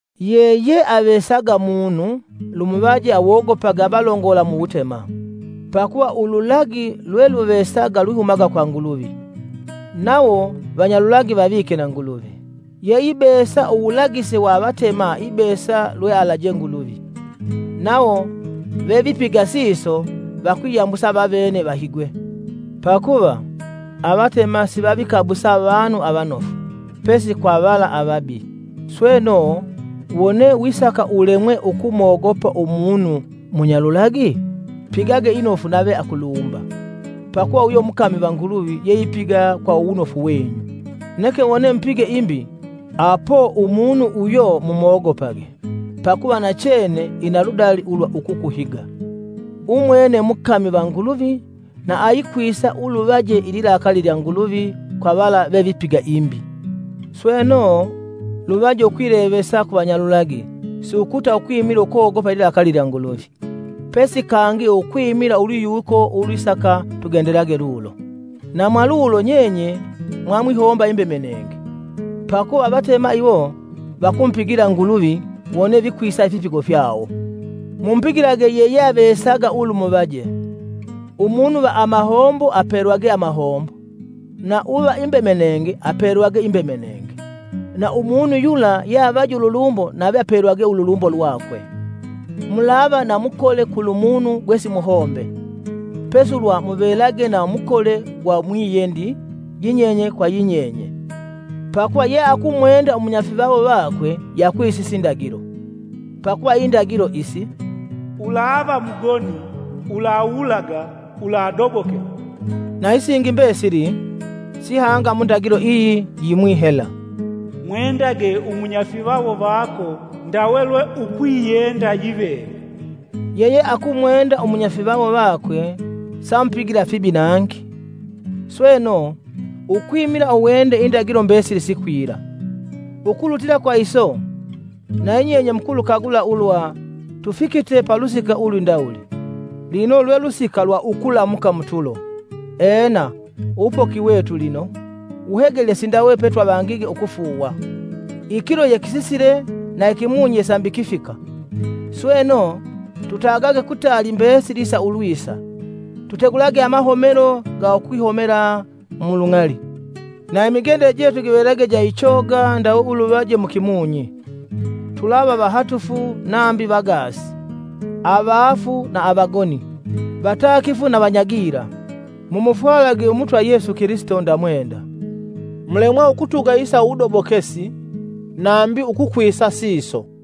Yeyeavesaga munu lumuvaje awogopage avalongola mu wutema; pakuva ululagi lweluvesaga lwihumaga kwa Nguluvi, nawo vanyalulagi vavike na Nguluvi. Yeibesa uwulagise wa avatema ibesa lwealaje Nguluvi, nawo vevipiga siso vakwiyambusa vavene vahigwe. Pakuva; avatema sivavikabusa avanu avanofu, pesi kwa vala avabi. Sweno, wone wisaka ulemwe ukumogopa umunu munyalulagi? Pigage inofu nave akulumba, pakuva uyo mukami va Nguluvi yeipiga kwa uwunofu wenyu. Neke wone mupige imbi apo umunu uyo mumwogopage pakuva nachene ina ludali ulwa ukukuhiga. Umwene mukami va Nguluvi na ayikwisa uluvaje ililakali lya Nguluvi kwa vala veipiga imbi. Sweno, luvaje ukwilevesa kuvanyalulagi si ukuta ukwimila ukogopa ililakali lya Nguluvi, pesi kangi ukwimila ulwiyiwuko ulwisaka tugendelage lulo. Na mwa lulo nyenye mwamwihomba imbemenenge, pakuva avatema iwo vakumupigila Nguluvi wone vikwisa ifipigo fyawo. Mumupigilage yeyeavesaga ulumuvaje, umunu va amahombo apelwagwe amahombo, na uva imbemenenge apelwagwe imbemenenge, na umunu yula yeavaje ululumbo nave apelwagwe ululumbo lwakwe. Mulava na mukole kulumunu gwesimuhombe, pesi ulwa muvelage na mukole gwa mwiyendi yinyenye kwa yinyenye. Pakuva yeakumwenda umunyafivawo wakwe yeakwisise indagilo. Pakuva indagilo isi, “Ulava mugoni; ulawulaga; uladobokela.” na isingi mbesili, sihanga mu ndagilo iyi yimwi hela, “Mwendage umunyafivawo vako ndawe lwe ukwiyenda yiveve.” Yeyeakumwenda umunyafivawo vakwe samupigila fibi nangi. Sweno, ukwimila uwende indagilo mbesili sikwila. Ukulutila kwa iso, na yinyenye mukulukagula ulwa tufikite palusika ulwindawuli, lino lwe lusika lwa ukulamuka mutulo, ena, uwupoki wetu lino, wuhegelye sindawe petwavangige ukufuuwa. Ikilo yekisisile na ikimunyi ye sambi kifika. Sweno, tutagage kutali mbesili isa ulwisa, tutegulage amahomelo ga ukwihomela mu lung'ali. Na imigendele jetu givelage ja ichoga ndawe ulunoje mu kimunyi, tulava vahatufu nambi vagaasi, avaafu na avagoni, vatakifu na vanya gila. Mumufwalage Umutwa Yesu Kilisito nda mwenda, mulemwa ukuleka muwudobokesi nambi ukwisa siso.